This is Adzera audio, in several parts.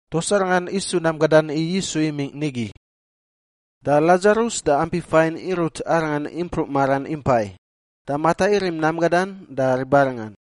Tuas arangan isu nam gadan i Yisu imingꞌ nigi. Da Ladzarus da ampi fain irut Arangan impruꞌ maran impai, da Mata irim nam gadan da ribarangan.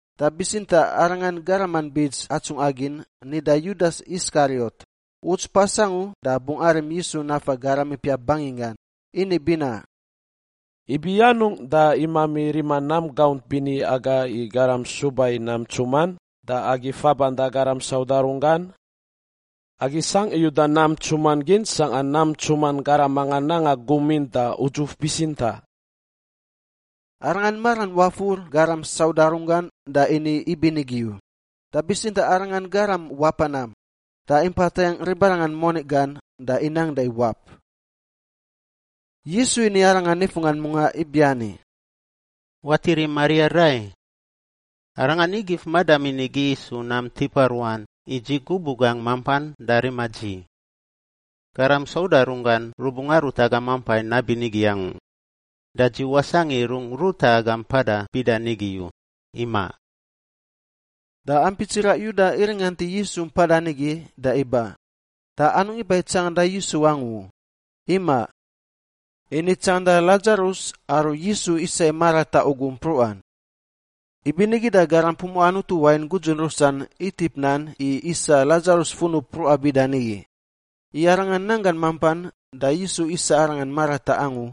Da bitsintaꞌ arangan garaman bits atsungꞌa gin nida Yudas Iskariot — uts pas angu da bungꞌ arim Yisu nafa garam ipiap banginggan — ini binaꞌ, “Ibi anungꞌ da imami rima nam gaunt bini aga i garam suba i nam ntsuman da agi faban da garam sauda runggan? Agi sangꞌ i uda nam ntsuman gin sangꞌa nam ntsuman garam mangan nanga gum in da udzuf bitsintaꞌ!” Arangan maran wafur garam sauda runggan da ini ibinigi u, da bitsintaꞌ arangan garam wapa nam, da impa tayangꞌ ribarangan moni gan da inang da iwap. Yisu ini arangan nifunggan mungaꞌ ibiani, “Watiri Maria rai! Arangan ingif madamin igi isu nam tipa ruan i dzi gubuꞌ gangꞌ mampan da rima dzi. Garam sauda runggan rubungꞌ arut agam nampai nabinigi angu, da dzi wasangꞌ i rungꞌ ruta agam mpada bida nigi u, imaꞌ.” Da ampi tsiraꞌ Yuda iringant i Yisu mpada nigi da iba, da anungꞌ iba i tsanganda Yisu angu u, imaꞌ. Ini tsanganda Ladzarus aru Yisu isa i marataꞌ ugu mpruꞌan. Ibinigi da garam pumuꞌa Anutu wain gudzun rusan itip nan i isa Ladzarus funub mpruꞌan bida nigi, i arangan nanggan mampan da Yisu isa arangan marataꞌ angu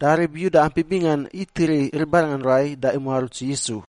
da rib Yuda ampi bingan itiri ribarangan rai da imuaruts Yisu.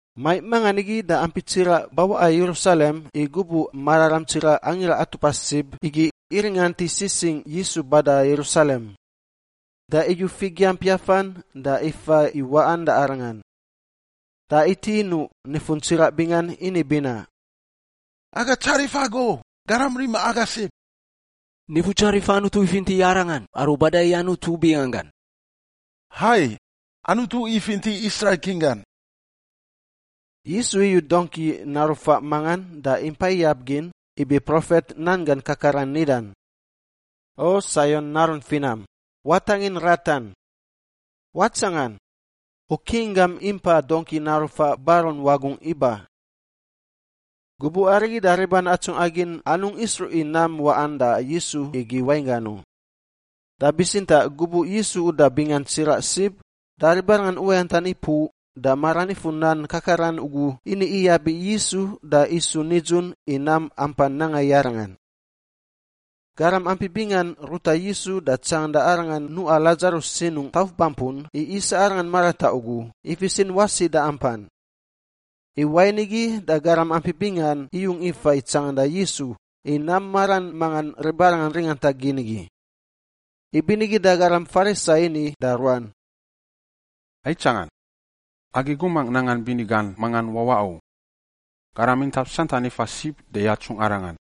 Maiꞌ mangan igi da ampi tsiraꞌ bawaꞌa Yerusalem i gubuꞌ mararam tsiraꞌ Angira Atupa Sib igi iringant i sisingꞌ Yisu bada Yerusalem. Da iyu figiamp yafan da ifa i waꞌan da Arangan. Da iti inuꞌ nifun tsiraꞌ bingan ini binaꞌ, “Aga tsarif Agu, Garam rima agai sib! Nifutsarif Anutu ifinti Arangan aru bada i Anutu binganggan! Hai, Anutu ifinti Israil King gan!” Yisu iyu dongki naru faꞌ mangan da impa iyab gin ibi profet nan gan kakaran nidan, “O Saion narun finam, watangin ratan. Watsangan! U King gam impa dongki naru faꞌ barun wagungꞌ iba.” Gubuꞌ arigi da riban atsungꞌa gin anungꞌ isruꞌ i nam waꞌan da Yisu igi wainggan u. Da bitsintaꞌ gubuꞌ Yisu uda bingan tsiraꞌ sib da ribarangan uwayantan ipuꞌ da maran ifur nan kakaran ugu ini iyab i Yisu da isu nidzun i nam ampan nanga i Arangan. Garam ampi bingan ruta Yisu da tsanganda Arangan nuꞌa Ladzarus sinungꞌ tauf bampun i isa arangan marataꞌ ugu, ifisin wasi da ampan. I wain igi da garam ampi bingan iyung ifa i tsanganda Yisu i nam maran mangan ribarangan ringanta gin igi. Ibinigi da garam Farisai ini da ruan, “Aitsangan! Agi gumangꞌ nangan bini gan mangan wawaꞌ u. Garam intap santan ifa sib da yatsung arangan!”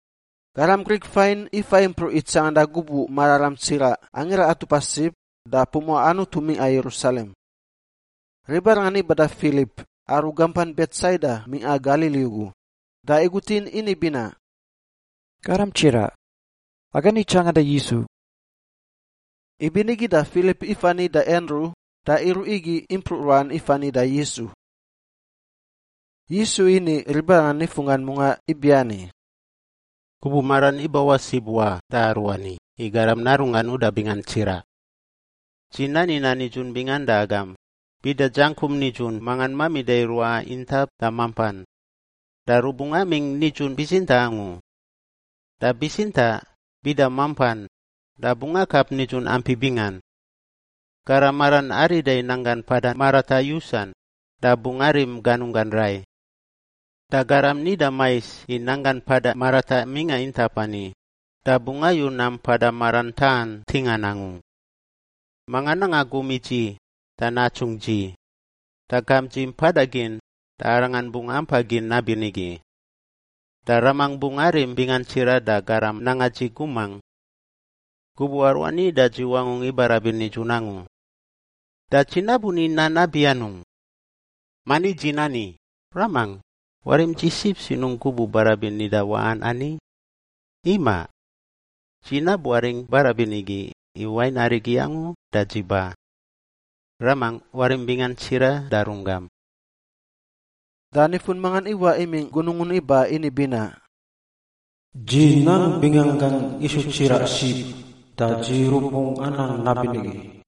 Garam Grik fain ifa impruꞌ i tsanganda gubuꞌ mararam tsiraꞌ Angira Atupa Sib da pumuꞌa Anutu mingꞌa Yerusalem. Ribarangan iba da Filip, aru gampan Betsaida mingꞌa Galili ugu, da igutin ini binaꞌ, “Garam tsiraꞌ, aga ni tsanganda Yisu.” Ibinigi da Filip ifani da Andru da iruꞌ igi impruꞌ ruan ifani da Yisu. Yisu ini ribarangan nifunggan mungaꞌ ibiani, “Gubuꞌ maran ibawaꞌ sib wa da aruani i Garam Narunggan uda bingan tsiraꞌ. Dzi nani nan nidzun bingan da agam, bida dzangkum nidzun mangan mamida i ruaꞌa intap da mampan, da rubungꞌ amingꞌ nidzun bitsintaꞌ angu. Da bitsintaꞌ bida mampan da bungꞌ akap nidzun ampi bingan. Garam maran arida i nanggan mpada marataꞌ yusan, da bungꞌ arim ganunggan rai. Da garam nida mais i nanggan mpada marataꞌ mingꞌa intap ani, da bungꞌ ayu nam mpada maran taꞌan ntingan angu. Manga nanga gum i dzi da natsungꞌ dzi, da gamp dzi mpada gin da arangan bungꞌ ampa gin nabinigi. Da Ramangꞌ bungꞌ arim bingan tsiraꞌ da garam nanga dzi gumangꞌ. Gubuꞌ aruani da dzi wangungꞌ ibarabin nidzun angu. Da dzi nabuni nan nabi anungꞌ? Mani dzi nida, ‘Ramangꞌ, warim dzi sib sinungꞌ gubuꞌ barabin nida waꞌan ani’? Imaꞌ. Dzi nabuaringꞌ barabin igi, i wain arigi angu da dzi ba. Ramangꞌ, warim bingan tsiraꞌ da runggam!” Da nifun mangan iwaꞌ imingꞌ gunungun iba ini binaꞌ, “Dzi nang binganggangꞌ isu tsiraꞌ sib da dzi rubungꞌ anang nabinigi.”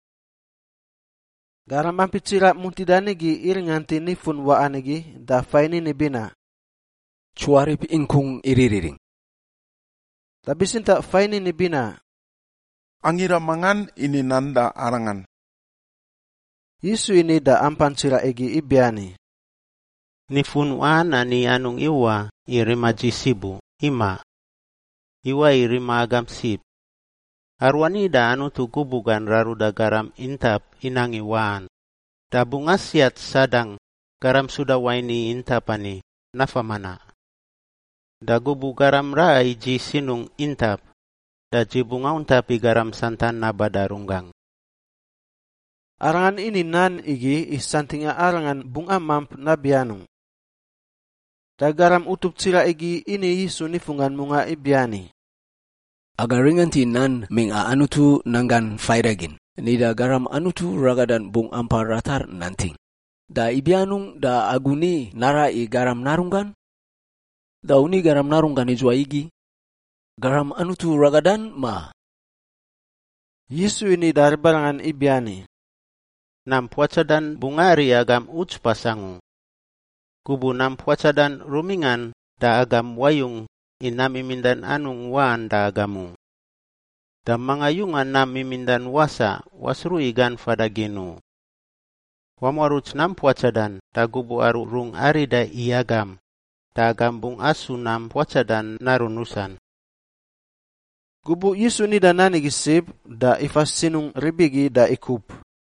Garam ampi tsiraꞌ muntida nigi iringant i nifun waꞌan igi da fain ini binaꞌ, “Tsuarip ingkung iririring.” Da bitsintaꞌ fain ini binaꞌ, “Angira mangan ini nan da arangan.” Yisu ini da ampan tsiraꞌ igi ibiani, “Nifun waꞌan ani anungꞌ iwaꞌ i rima dzi sib u, imaꞌ. Iwaꞌ i rima agam sib. Aruani da Anutu gubuꞌ gan raruda garam intap inang i waꞌan, da bungꞌ asiat Sadang, garam suda wain i intap ani, nafa manaꞌ. Da gubuꞌ garam raꞌa i dzi sinungꞌ intap da dzi bungꞌ auntap i garam santan naba da runggangꞌ.” Arangan ini nan igi i santingꞌa Arangan bungꞌ amamp nabi anungꞌ. Da garam utup tsiraꞌ igi ini Yisu nifun mungaꞌ ibiani, “Aga ringant i nan mingꞌa Anutu Nan Gan Faidagin nida Garam Anutu Ragadan bungꞌ ampa ratar nanting, da ibi anungꞌ da agu ni naraꞌ i Garam Narunggan? Da u ni Garam Narunggan idzuwai igi? Garam Anutu Ragadan, ma?” Yisu ini da ribarangan ibiani, “Nam puatsadan bungꞌ ari agam uts pas angu. Gubuꞌ nam puatsadan rumingꞌan da agam wayung, i nam mimindan anungꞌ waꞌan da agam u. Da manga yunga nam mimindan wasaꞌ wasruꞌ i gan fada gin u. Wamuaruts nam puatsadan da gubuꞌ aru rungꞌ arida i agam, da agam bungꞌ asu nam puatsadan narun rusan.” Gubuꞌ Yisu nida nan igi sib da ifa sinungꞌ rib igi da ikup.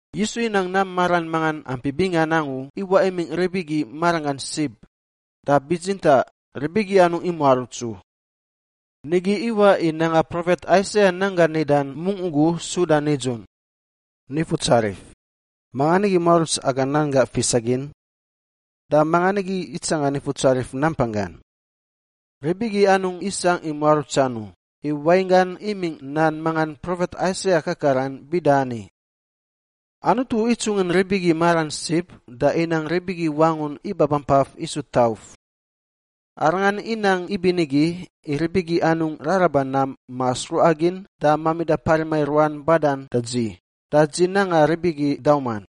Yisu inang nam maran mangan ampi bingan angu iwaꞌ imingꞌ rib igi maranggan sib, da bitsintaꞌ rib igi anungꞌ imuaruts u. Nigi iwaꞌ i nanga profet Aisaia nan gan nida mungꞌ ugu suda nidzun, “Nifutsarif, mangan nigi muaruts aga nan gaꞌ fisagin? Da mangan nigi itsanga Nifutsarif nampanggan?” Rib igi anungꞌ isangꞌ i muarutsan u, i wainggan imingꞌ nan mangan profet Aisaia kakaran bida ani, “Anutu itsungin rib igi maran sib da inang rib igi wangun ibabampaf isu tauf. Arangan inang ibinigi i rib igi anungꞌ raraba nam ma sruꞌa gin da mamida parima i ruan badan da dzi, da dzi nanga rib igi dauman.”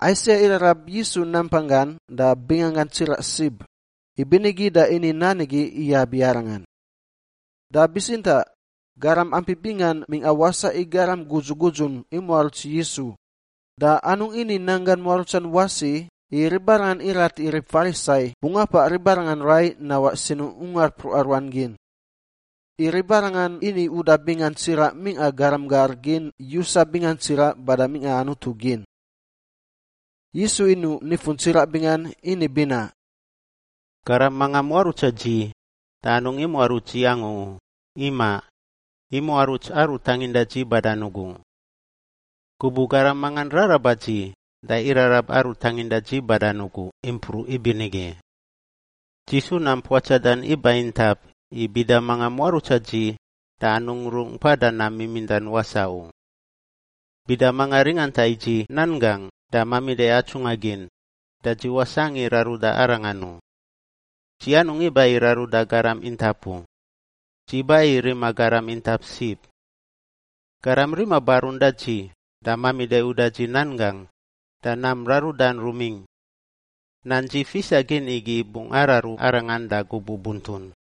Aisaia irarab Yisu nampanggan da binganggan tsiraꞌ sib, ibinigi da ini nan igi iyab i Arangan. Da bitsintaꞌ garam ampi bingan mingꞌa wasaꞌ i garam gudzu gudzun imuaruts Yisu, da anungꞌ ini nanggan muarutsan wasi i ribarangan irat i rib Farisai bungꞌ apaꞌ ribarangan rai nawaꞌ sinungꞌ ungar mpruꞌa ruan gin. I ribarangan ini uda bingan tsiraꞌ mingꞌa garam gar gin yusa bingan tsiraꞌ bada mingꞌa Anutu gin. Yisu inuꞌ nifun tsiraꞌ ini binaꞌ, “Garam mangan muarutsa dzi da anungꞌ imuaruts dzi angu u, imaꞌ. Imuaruts Aru tanginda dzi badan ugu. Gubuꞌ garam mangan raraba dzi, da irarab Aru tanginda dzi badan ugu impruꞌ ibinigi. Dzi su nam puatsadan iba intap i bida mangan muarutsa dzi da anungꞌ rungꞌ mpada nam mimindan wasaꞌ u. Bida manga ringanta i dzi nan gangꞌ da mamida atsungꞌa gin, da dzi wasangꞌ i raruda arangan u. Dzi anungꞌ iba i raruda garam intap u; dzi ba i rima garam intap sib. Garam rima barun da dzi da mamida uda dzi nan gangꞌ, da nam rarudan rumingꞌ. Nan dzi fisa gin igi bungꞌ araru arangan da gubuꞌ buntun.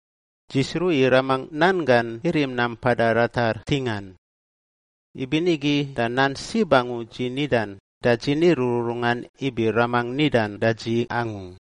Dzi sruꞌ i Ramangꞌ nan gan irim nam mpada ratar ntingan. Ibinigi da nan sib angu dzi nidan, da dzi ni rururungan ibi Ramangꞌ nidan da dzi angu.”